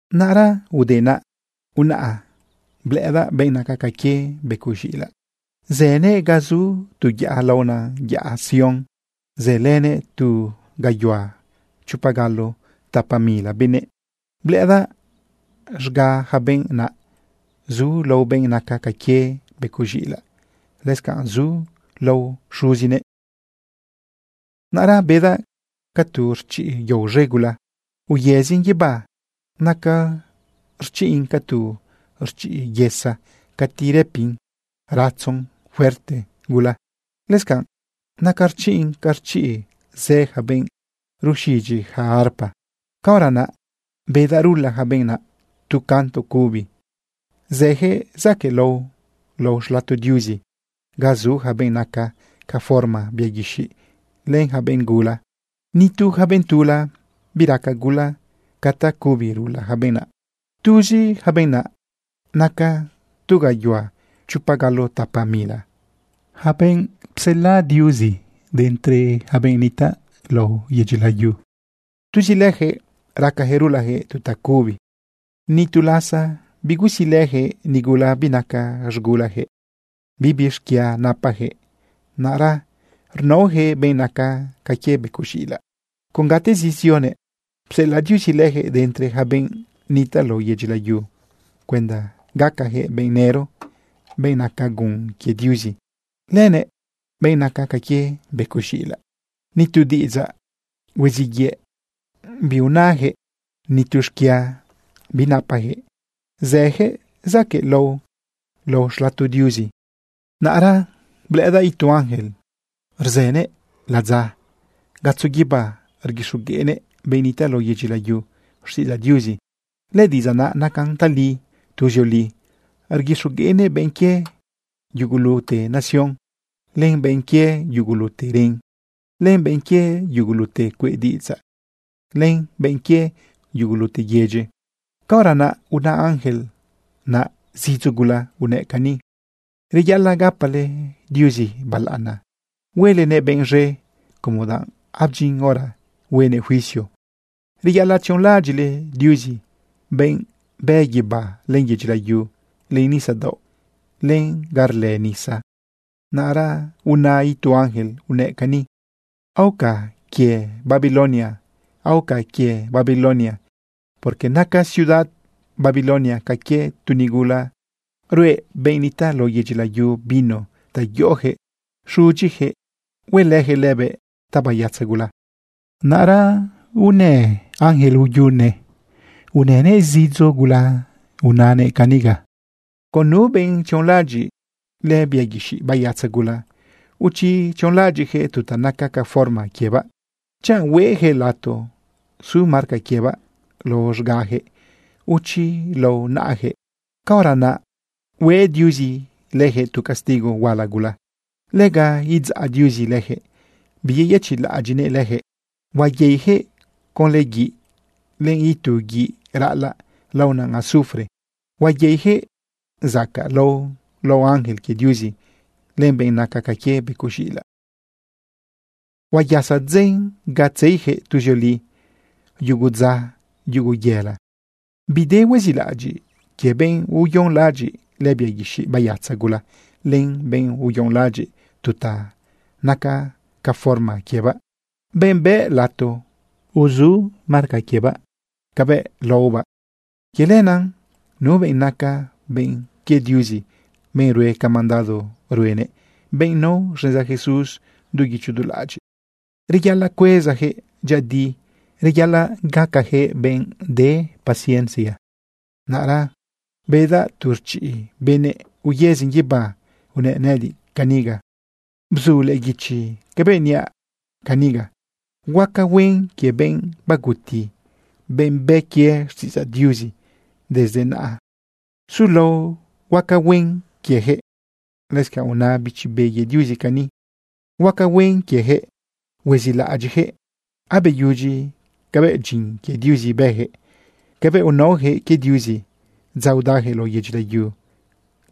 Naꞌra ude naꞌ, unaꞌa blëꞌëdaꞌ benꞌ naca ca quie becoꞌ z̃iꞌilaꞌ. Zënëꞌ ga zu tu yaꞌa laona yaꞌa Sión. Zëlënëꞌ tu gayuhua chopa galo tapa mila benëꞌ. Blëꞌëdaꞌ z̃ga ja benꞌ naꞌ zu lao benꞌ naca ca quie becoꞌ z̃iꞌilaꞌ, lëscanꞌ zu lao xuzinëꞌ. Naꞌra bedaꞌ ca tu rchiꞌ yao z̃e gula uyëzin guibá. Naca rchiꞌn ca tu rchiꞌ yesa cati rëpin ratzon fuerte gula. Lëscanꞌ naca rchiꞌn ca rchiꞌ zë ja benꞌ ruxidyi ja arpa. Caora naꞌ bedaꞌ rula ja benꞌ naꞌ tu canto cubi. Zëjëꞌ zaquëꞌlao lao xlato Diuzi ga zu yaca benꞌ naca ca forma bia guixiꞌ len ja benꞌ gula. Ni tu ja benꞌ tula biraca gula ca tacubi rula ja benꞌ naꞌ. Tuzi ja benꞌ naca tu gayuhua chopa galo tapa mila, ja benꞌ psela Diuzi de entre ja benꞌ nitaꞌ lao yedyi layu, tuzi lëjëꞌ racajëꞌ rulajëꞌ tu tacubi. Ni tu lasa bigusilëjëꞌ nigula binaca z̃gulajëꞌ. Bibi xquia napajëꞌ. Naꞌra rnaojëꞌ benꞌ naca ca quie becoꞌ z̃iꞌilaꞌ con gatezi zionëꞌ. Psela Diuzi lëjëꞌ de entre ja benꞌ nitaꞌ lao yedyi layu cuenda gacajëꞌ benꞌ nëro, benꞌ naca gun quie Diuzi lënëꞌ benꞌ naca ca quie becoꞌ z̃iꞌilaꞌ. Ni tu diꞌidzaꞌ huiziꞌ yëꞌ biunajëꞌ. Ni tu xquia binapajëꞌ zëjëꞌ zaquëꞌlao lao xlato Diuzi. Naꞌra blëꞌëdaꞌ itu ángel rzënëꞌ ladza gatzo guibá. Rguixogueꞌnëꞌ benꞌ nitaꞌ lao yedyi layu xtiꞌidzaꞌ Diuzi. Lëdiꞌidzaꞌ naꞌ nacan tali tuzioli. Rguixogueꞌnëꞌ benꞌ quie yugulute nación, len benꞌ quie yugulute ren, len benꞌ quie yugulute cueꞌ diꞌidzaꞌ, len benꞌ quie yugulute yedyi. Caora naꞌ una ángel naꞌ zidzo gula unëꞌ cani: ―Reyaꞌalaꞌ gapale Diuzi balaꞌana huelenëꞌ benꞌ z̃e, como danꞌ abdyin hora huenëꞌ juicio. Reyaꞌalaꞌ tzionlaꞌadyiꞌle Diuzi, benꞌ bë guibá, len yedyi layu, len nisadaoꞌ, len ga rlë nisa. Naꞌra una itu ángel unëꞌ cani: ―Aoca quie Babilonia, aoca quie Babilonia, porque naca ciudad Babilonia ca quie tu nigula ruꞌe benꞌ nitaꞌ lao yedyi layu vino ta yoꞌojëꞌ iz̃udyijëꞌ huelëjëꞌ lëbëꞌ tabayatza gula. Naꞌra una ángel uyune. Unëꞌ zidzo gula unëꞌ caniga: ―Con nu benꞌ tzionlaꞌadyiꞌ lëbia guixiꞌ bayatza gula, o chi tzionlaꞌadyiꞌjëꞌ tu ta naca ca forma quiebaꞌ, chanꞌ hueꞌjëꞌ lato su marca quiebaꞌ lao z̃gajëꞌ, o chi lao naꞌajëꞌ, caora naꞌ hue Diuzi lëjëꞌ tu castigo huala gula. Lega idzaꞌ Diuzi lëjëꞌ biyeyëchiꞌlaꞌadyiꞌnëꞌ lëjëꞌ. Huayeijëꞌ conlë guiꞌ len itu guiꞌ raꞌalaꞌ laona azufre. Huayeijëꞌ zacaꞌlao lao ángel quie Diuzi len benꞌ naca ca quie becoꞌ z̃iꞌilaꞌ. Huayasa dzen ga tzeijëꞌ tuzioli. Yugu dza, yugu yela, bide huezilaꞌadyiꞌ quie benꞌ uyonlaꞌadyiꞌ lëbia guixiꞌ bayatza gula len benꞌ uyonlaꞌadyiꞌ tu ta naca ca forma quiebaꞌ, benꞌ bëꞌ lato uzu marca quiebaꞌ cabëꞌ laobaꞌ. Quie lenaꞌ nu benꞌ naca benꞌ quie Diuzi, benꞌ rue ca mandado ruenëꞌ, benꞌ nao xneza Jesús du guicho du laꞌadyiꞌ, reyaꞌalaꞌ cuezajëꞌ dyëꞌëdi, reyaꞌalaꞌ gacajëꞌ benꞌ de paciencia. Naꞌra bedaꞌ tu rchiꞌ benëꞌ uyëzin guibá. Unëꞌ nëꞌëdiꞌ caniga: ―Bzu lëꞌë guichi cabëꞌ niaꞌ caniga: “Huaca huen quie benꞌ baguti, benꞌ bë quie xtiꞌidzaꞌ Diuzi. Desde naꞌa sulao huaca huen quiejëꞌ.” Lëscanꞌ una Bichi Be quie Diuzi cani: “Huaca huen quiejëꞌ. Huezilaꞌadyiꞌjëꞌ abeyudyi cabëꞌ dyin quie Diuzi bëjëꞌ. Cabëꞌ unaojëꞌ quie Diuzi dza udajëꞌ lao yedyi layu,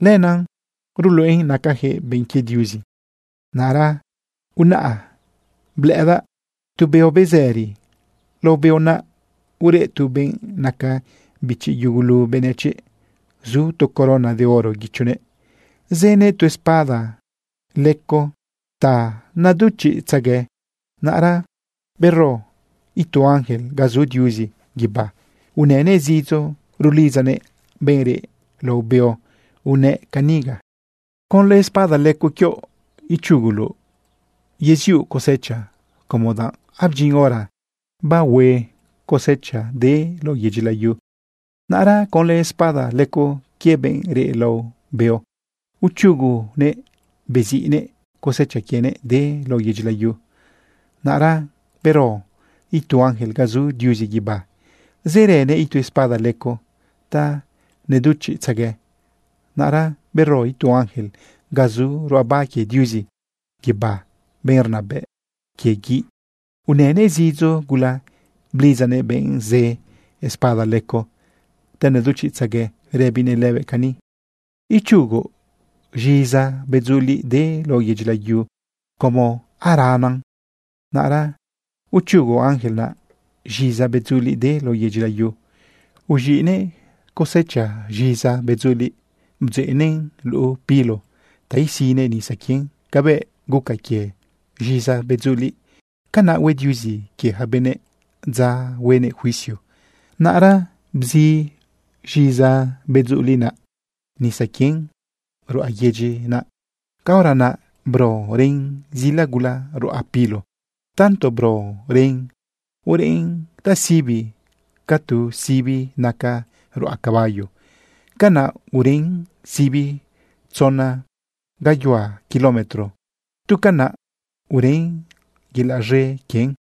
lenaꞌ ruluꞌen nacajëꞌ benꞌ quie Diuzi.” Naꞌra unaꞌa blëꞌëdaꞌ tu beo bezëri. Lao beo naꞌ ureꞌ tu benꞌ naca bichi yugulu benëchiꞌ. Zu tu corona de oro guichonëꞌ. Zënëꞌ tu espada leco ta neduchiꞌtzague. Naꞌra bero itu ángel ga zu Diuzi guibá. Unënëꞌ zidzo rulidzanëꞌ benꞌ reꞌ lao beo unëꞌ caniga: ―Conlë espada leco quioꞌ ichuguloꞌ yeziuꞌ cosecha, como danꞌ abdyin hora bara cosecha de lao yedyi layu. Naꞌra conlë espada leco quie benꞌ reꞌ lao beo, uchugunëꞌ beziꞌnëꞌ cosecha quienëꞌ de lao yedyi layu. Naꞌra bero itu ángel ga zu Diuzi guibá. Zërënëꞌ itu espada leco ta neduchiꞌtzague. Naꞌra bero itu ángel ga zu ruꞌaba quie Diuzi guibá, benꞌ rnabëꞌ quie guiꞌ. Unënëꞌ zidzo gula blidzanëꞌ benꞌ zë espada leco ta neduchiꞌtzague rëbinëꞌ lëbëꞌ cani: ―Ichugoꞌ z̃iza bedzuliꞌ de lao yedyi layu como aranan. Naꞌra uchugo ángel naꞌ z̃iza bedzuliꞌ de lao yedyi layu. Uz̃iꞌnëꞌ cosecha z̃iza bedzuliꞌ bdzeꞌnëꞌn luꞌu pilo ta isinëꞌ nisa quien. Cabëꞌ guca quie z̃iza bedzuliꞌ, canaꞌ hue Diuzi quie ja benëꞌ dza huenëꞌ juicio. Naꞌra bzi z̃iza bedzuliꞌ naꞌ nisa quien ruꞌa yedyi naꞌ. Caora naꞌ bro ren zila gula ruꞌa pilo. Tanto bro ren ureꞌn tasibi ca tu sibi naca ruꞌa caballo. Canaꞌ ureꞌn sibi tzona gayuhua kilómetro. Tu canaꞌ ureꞌn yelaꞌ z̃e quien.